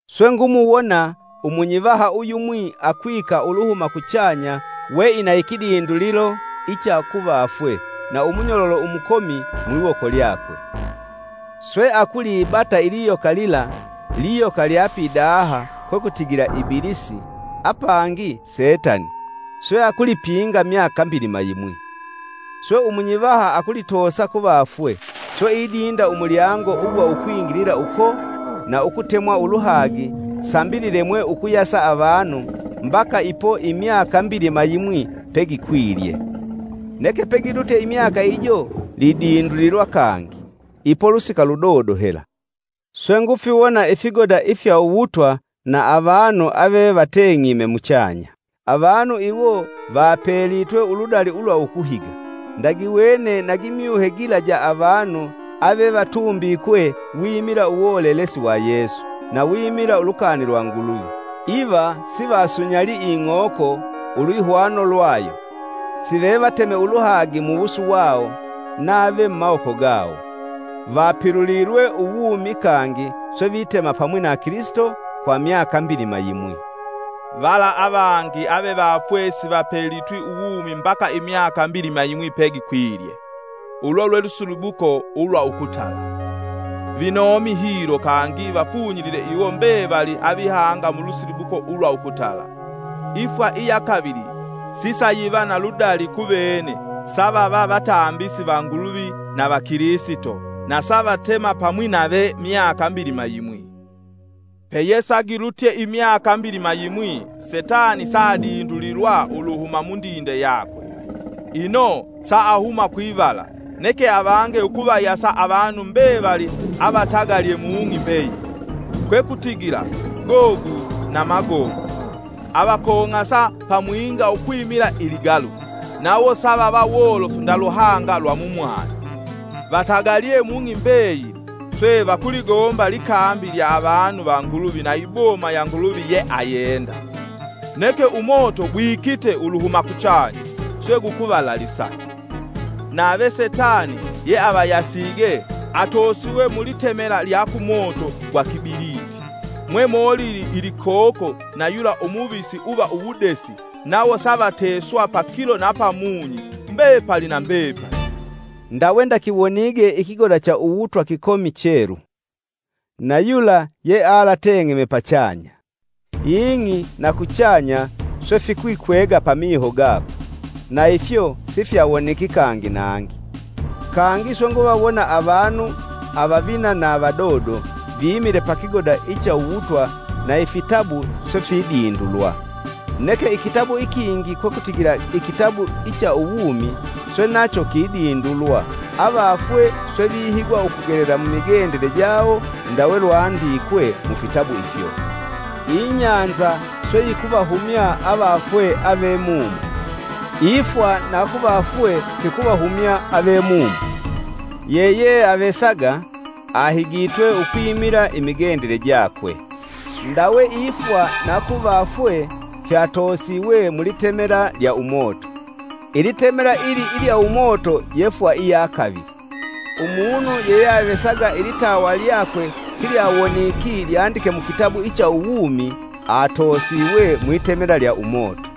Swe ngumuwona umunyivaha uyumwi akwika uluhuma kuchanya we ina ikidindulilo icha kuvafwe na umunyololo umukomi mwiwoko lyakwe. Swe akulibata iliyoka lila-Iiyoka lya pidaha kwekutigila Ibilisi, apangi Setani-swe akulipinga myaka mbilima yimwi. Swe umunyivaha akulitoosa kuvafwe, swe idinda umulyango ugwa ukwingilila uko na ukutemwa uluhagi sambi lilemwe ukuyasa avanu mbaka ipo imyaka mbilima yimwi pegikwilye. Neke pegilutye imyaka ijo, lidindulilwa kangi, ipo lusika ludodo hela. Swe ngufiwona ifigoda ifya uwutwa na avanu ave vateng'ime muchanya, avanu iwo vapelitwe uludali ulwa ukuhiga. Ndagiwene nagi myuhe gila ja avanu avevatumbikwe wimila uwolelesi wa Yesu na wimila ulukani lwa Nguluvi, iva sivasunyalii ing'oko ulwihwano lwayo, sive vateme uluhagi muwusu wawo nave mumawoko gawo. Vapilulilwe uwumi kangi swe vitema pamwi na Kilisito kwa myaka mbilima yimwi. (Vala avangi avevafwe sivapelitwe uwumi mbaka imyaka mbilima yimwi pegikwilye) ulo lwe lusilibuko ulwa ukutala. Vinomi hilo kangi vafunyilile iwo mbevali avihanga mulusilibuko ulwa ukutala, ifwa iya kavili sisayiva na ludali kuvene savava vatambisi va Nguluvi na va Kilisito na savatema pamwi nave myaka mbilima yimwi. Peyesagilutye imyaka mbilima yimwi, setani saadindulilwa uluhuma mundinde yakwe. Ino sa ahuma kwivala, neke avange ukuvayasa avanu mbevali avatagalye mung'i mbeyili, kwekutigila, Gogu na Magogu, avakong'asa pamwinga ukwimila iligalu. Nawo savava wolofu nda luhanga lwa mumwani. Vatagalye mung'i mbeyili, swe vakuligomba likambi lya avanu va Nguluvi na iboma ya Nguluvi yeayenda. Neke umoto gwikite uluhuma kuchanya, swe gukuvalalisa. Nave setani ye avayasige, atoosiwe mulitemela lyakumoto gwa kibiliti, mwe molili ilikoko na yula umuvisi uva uwudesi nawo savateswa pakilo na pamunyi, mbepali na mbepali. Ndawe ndakiwonige ikigoda cha uwutwa kikomi chelu, na yula yealateng'eme pachanya. Ing'i na kuchanya swe fikwikwega pamiho gakwe; na ifyo sifyawoniki kangi nangi. Kangi swe nguvawona avanu, avavina na vavadodo vimile pakigoda icha uwutwa na ifitabu swe fidindulwa. Neke ikitabu ikingi kwekutigila ikitabu icha uwumi, swe nacho kidindulwa avafwe swe vihigwa ukugelela mumigendele jawo ndawe lwandikwe mufitabu ifyo. Ibahali swe yikuvahumya avafwe avemumo, ifwa na kuvafwe fikuvahumya ave mumo. Yeyeavesaga ahigitwe ukwimila imigendele jakwe. Ndawe ifwa na kuvafwe fyatoosiwe mulitemela lya umoto. Ilitemela ili ilya umoto yefwa iya kavili. Umunu yeyeavesaga ilitawa lyakwe silyawoniki lyandike mukitabu icha uwumi, atoosiwe mwitamela lya umoto.